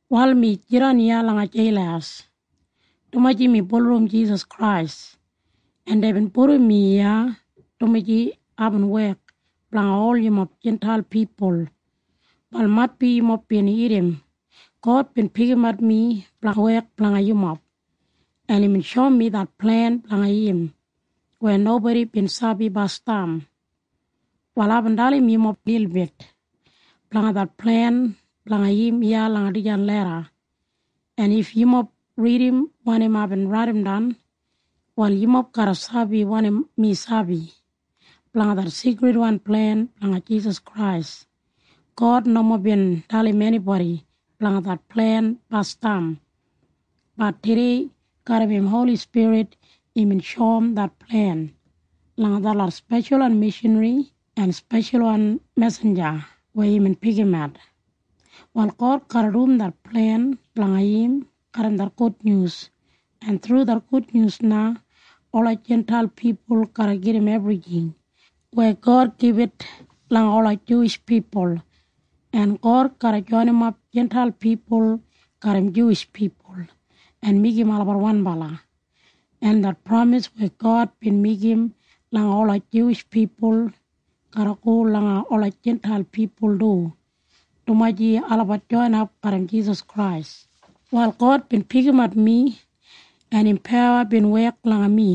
Wal mi jidan iya lokdap langa jeil dumaji mi bulurrum Jisas Krais, en deibin pudum mi iya dumaji aibin wek blanga ol yumob Jintail pipul. Wal maitbi yumob bin irrim God bin pikimat mi blanga wek blanga yumob, en imbin shoum mi det plen blanga im weya nobodi bin sabi bifo. Wal aibin dalim yumob lilbit blanga det plen blanga im iya langa dijan leda, en if yumob ridim wanim aibin raidimdan, wal yumob garra sabi wanim mi sabi blanga det sigridwan plen blanga Jisas Krais. God nomo bin dalim enibodi blanga det plen bifo. Bat tudei garram im Holi Spirit imbin shoum det plen langa detlot speshalwan mishanri en speshalwan mesinja weya imbin pikimat. Wal God garra dum det plen blanga im garram det gudnyus, en thru det gudnyus na ola Jintail pipul garra gedim ebrijing weya God gibit langa ola Juwish pipul, en God garra joinimap Jintail pipul garram Juwish pipul en meigim olabat wanbala, en det pramis weya God bin meigim langa ola Juwish pipul garra go langa ola Jintail pipul du, dumaji olabat joinap garram Jisas Krais. Wal God bin pikimat mi, en im pawa bin wek langa mi,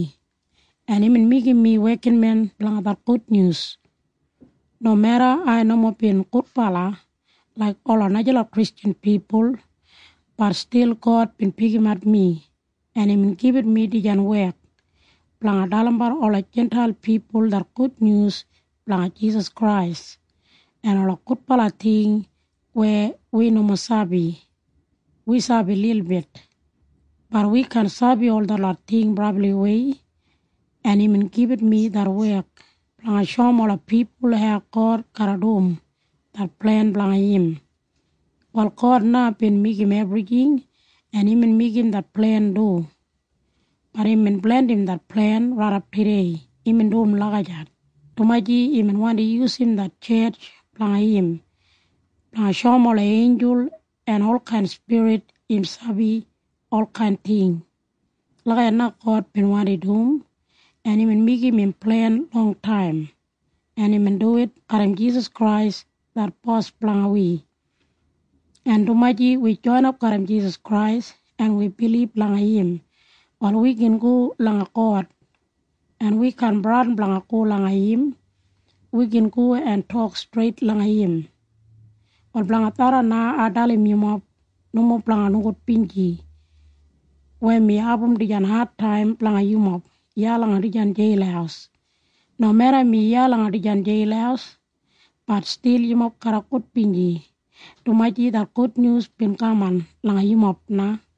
en imbin meigim mi wekinmen blanga det gudnyus. Nomeda ai nomo bin gudbala laik ola najalot Kristjan pipul, bat stil God bin pikimat mi, en imbin gibit mi dijan wek blanga dalimbat ola Jintail pipul det gudnyus blanga Jisas Krais en ola gudbala ting weya wi nomo sabi. Wi sabi lilbit. Bat wi kaan sabi ol detlot ting brabliwei. En imbin gibit mi det wek blanga shoum ola pipul hau God garra dum det plen blanga im. Wal God na bin meigim ebrijing, en imbin meigim det plen du. Bat imbin blandim det plen raidap tudei. Imbin dum lagijat, dumaji imbin wandi yusum det tjetj blanga im blanga shoum ola einjul en olkain spirit im sabi olkain ting. Lagijat na God bin wandi dum, en imbin meigim im plen longtaim, en imbin duwit garram Jisas Krais det Bos blanga wi, en dumaji wi joinap garram Jisas Krais en wi bilib langa im, wal wi gin go langa God, en wi kaan bradin blanga go langa im. Wi gin go en tok streit langa im. Wal blanga tharran na ai dalim yumob nomo blanga nogudbinji weya mi abum dijan adtaim blanga yumob iya langa dijan jeil. Nomeda mi iya langa dijan jeil, bat stil yumob garra gudbinji, dumaji det gudnyus bin kaman langa yumob na.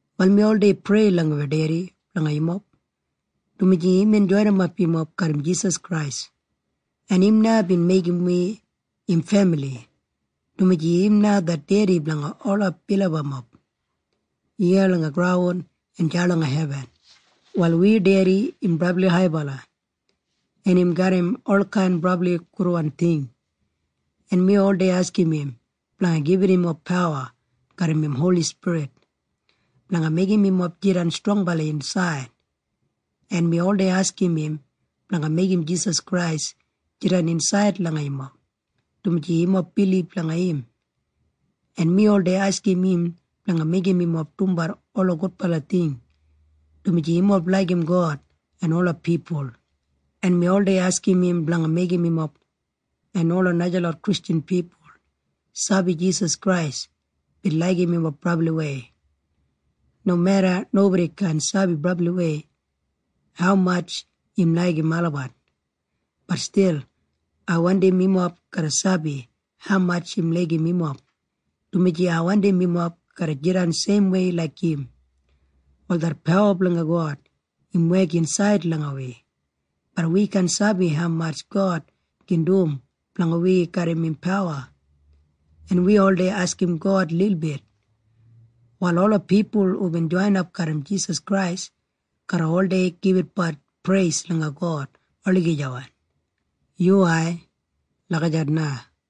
Wal mi oldei prei langa wi Dedi blanga yumob, dumaji imbin joinimap yumob garram Jisas Krais, en im na bin meigim wi im femili, dumaji im na det Dedi blanga ola bilibamob iya langa graun en deya langa hebin. Wal wi Dedi im brabli haibala, en im garram olkain brabli gudwan ting, en mi oldei askim im blanga gibit yumob pawa garram im Holi Spirit blanga meigim yumob jidan strongbala insaid, en mi oldei askim im blanga meigim Jisas Krais jidan insaid langa yumob dumaji yumob bilib langa im, en mi oldei askim im blanga meigim yumob dumbat ola gudbala ting dumaji yumob laigim God en ola pipul, en mi oldei askim im blanga meigim yumob en ola najalot Kristjan pipul sabi Jisas Krais bin laigim yumob brabliwei. Nomeda nobodi kaan sabi brabliwei haumatj im laigim olabat, bat stil ai wandim yumob garra sabi haumatj im laigim yumob, dumaji ai wandim yumob garra jidan seimwei laik im. Wal det pawa blanga God im wek insaid langa wi. Bat wi kaan sabi haumatj God gin dum blanga wi garram im pawa. En wi oldei askim God lilbit. Wal ola pipul hubin joinap garram Jisas Krais garra gibitbat preis langa God olagijawan. Yuwai. Lagijat na.